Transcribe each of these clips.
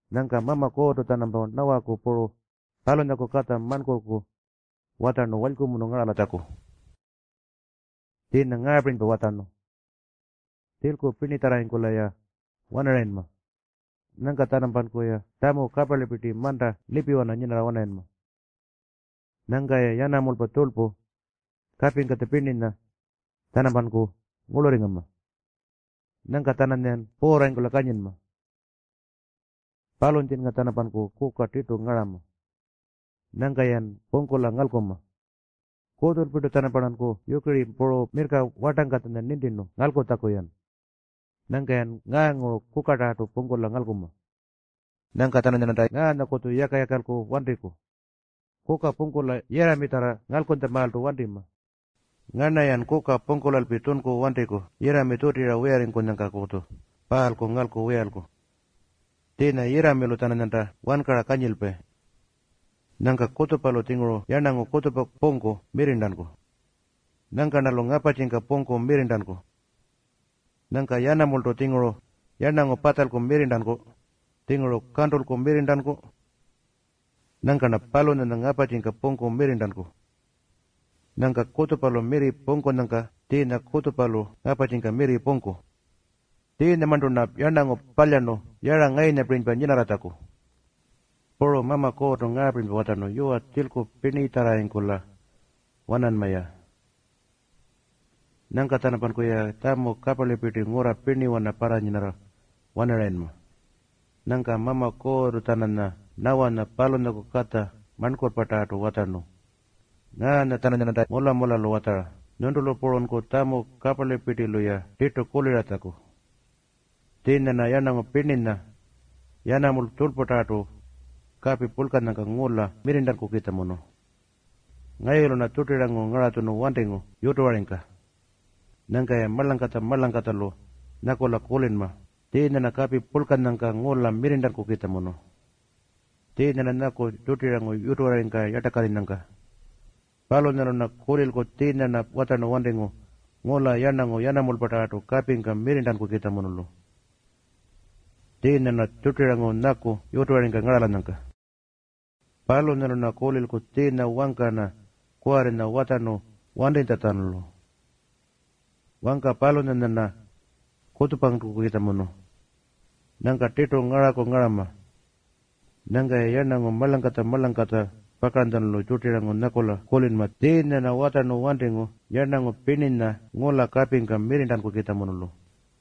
Nyangka Mama Kuurrtu-tjanampa Nawaku puru palunyaku katja marnkurrku watjarnu walykumunu ngaralatjaku. Tjiinya ngaapirinypa watjarnu, “Tjilku pirnitjarrarringkula-ya wanarayinma. Nyangka-tjanampankuya tjamu kaparlipirti manta lipiwana nyinarra-wanarayinma. Nyangka-ya yanamulpa, tjurlpu puru kapingkatja pirninya-tjanampanku ngurlurringama. Nyangka-tjananyayan puurrarringkula kanyinma. Palunyatjinnga-tjanampanku kuka tirtu ngarama. Nyangka-yan pungkula ngalkunma. Kutjulpirtu-tjanamparnanku yukiri puru mirrka wartangkatja nintirnu ngalkulatjaku-yan. Nyangka-yan ngaanguru kukatarrartu pungkula ngalkunma. Nyangka-tjananyarnanta ngaanyakutju yaka-yakalku wantiku. Kuka pungkula yirramitjarra ngalkunytjamaaltu wantima. Ngarna-yan kuka pungkulalpi tjunku wantiku yirrami tjutirra wiyarringkunyangkakutju paalku ngalku wiyalku. Tjiinya yirramilu-tjananyanta wankara kanyilpayi. Nyangka kutjupalu-tjinguru yarnangu kutjupa pungku mirrirntanku. Nyangka-rnalu ngaparrtjika pungku mirrirntanku. Nyangka yanamultu-tjinguru yarnangu patjalku mirrirntanku, tjinguru kantulku mirrirntanku. Nyangka-rna palunyanya ngaparrtjika pungku mirrirntanku. Nyangka kutjupalu mirri pungkunyangka tjiinya kutjupalu ngaparrtjika mirri pungku. Tjiinyamarntu-rna yarnangu palyarnu yara ngayunyapirinypa nyinarratjaku.” Puru Mama Kuurrtu ngaapirinypa watjarnu, “Yuwa, tjilku pirnitjarrarringkula-wananma-ya. Nyangka-tjanampankuyi tjamu kaparlipirti ngurra pirniwana parranyinarra-wanarayinma.” Nyangka Mama Kuurrtu-tjananya Nawanya palunyaku katja marnkurrpatarrartu watjarnu, “Ngaanya-tjananyarnanta mula-mulalu watjara nyuntulu purunku tjamu kaparlipirtilu-ya tirtu kuliratjaku. Tjiinya-rna ngula yarnangu pirninya, yanamulpa puru tjurlputarrartu kapi purlkanyangka mirrirntankukitjamunu. Ngayulu-rna tjurtirangu ngaratjunu wantingu yutuwaringka. Nyangka-ya marlangkatja-marlangkatjalu nyakula kulinma tjiinya-rna ngula kapi purlkanyangka mirrirntankukitjamunu. Tjiinya-rna nyaku tjurtirangu yutuwaringka yartakarrinyangka. Palunyalu-rna kulilku tjiinya-rna watjarnu wantingu ngula yarnangu yanamulpatarrartu kapingka mirrirntankukitjamunulu. Tjiinya-rna tjurtirangu nyaku yutuwaringka ngaralanyangka. Palunyalu-rna kulilku tjiinya wangka-rna kuwarri watjarnu wantitjalu. Wangka palunyanya-rna kutjupankukitjamunu. Nyangka tirtu ngaraku ngarama. Nyangka-ya yarnangu marlangkatja-marlangkatja pakaranytjalu tjurtirangu nyakula kulinma tjiinya-rna watjarnu wantingu ngula yarnangu pirninya kapingka mirrirntankukitjamunulu.”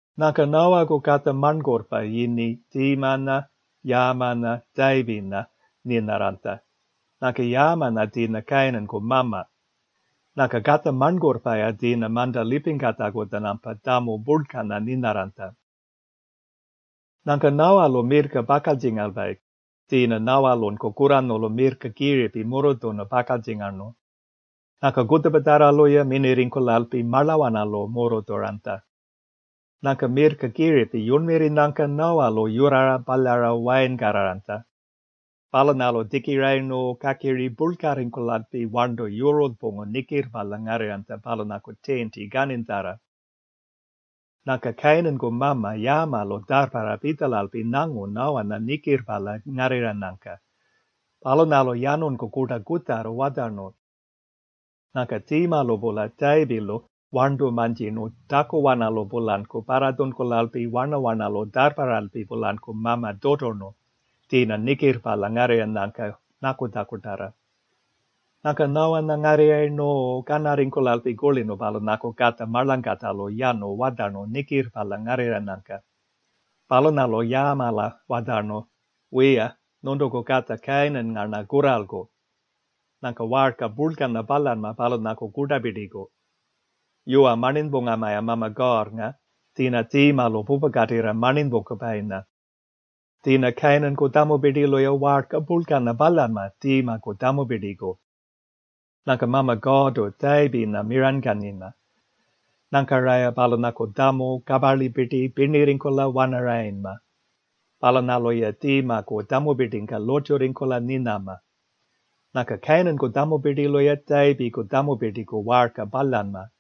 Nyangka Nawaku katja marnkurrpa yini Tjiimanya, Yaamanya, Tjayipinya nyinarranytja. Nyangka Yaamanya tjiinya Kayinanku mama. Nyangka katja marnkurrpa-ya tjiinya manta lipingkatjaku-tjanampa tjamu purlkanya nyinarranytja. Nyangka Nawalu mirrka pakaltjingalpayi. Tjiinya Nawalunku kurranyulu mirrka kiripi murrutjunu pakaltjingarnu. Nyangka kutjupatjarralu-ya minirringkulalpi marlawanalu murrutjuranytja. Nyangka mirrka kiripi yurnmirrinyangka Nawalu yurrara palyara wayinkarraranytja. Palunyalu tjikirayirnu kakiri purlkarringkulalpi warntu yurulypungu nikirrpalya ngarrirranytja palunyaku tiinti kaninytjarra. Nyangka Kayinanku mama Yaamalu tjarrparra pitjalalpi nyangu Nawanya nikirrpalya ngarrirranyangka. Palunyalu yanunku kurta kutjarra watjarnu. Nyangka Tjiimalu-pula Tjayipilu warntu mantjirnu takuwanalu-pulanku parratjunkulalpi warna-warnalu tjarrparralpi-pulanku mama tjuturnu, tjiinya nikirrpalya ngarrirranyangka nyakutjakutarra. Nyangka Nawanya ngarrirrayirnu kanarringkulalpi kulirnu palunyaku katja marlangkatjalu yanu watjarnu nikirrpalya ngarrirranyangka. Palunyalu Yaamala watjarnu, “Wiya, nyuntuku katja Kayinannga-rna kurralku. Nyangka waarka purlkanya palyanma palunyaku kurtapirtiku. Yuwa, marninypungama-ya Mama Kuurrnga, tjiinya Tjiimalu pupakatirra marninypungkupayinya. Tjiinya Kayinanku tjamupirtilu-ya waarka purlkanya palyanma Tjiimaku tjamupirtiku. Nyangka Mama Kuurrtu Tjayipinya miranykanyinma. Nyangka-raya palunyaku tjamu kaparlipirti pirnirringkula-wanarayinma. Palunyalu-ya Tjiimaku tjamupirtingka lurrtjurringkula nyinama. Nyangka Kayinanku tjamupirtilu-ya Tjayipiku tjamupirtiku waarka palyanma.”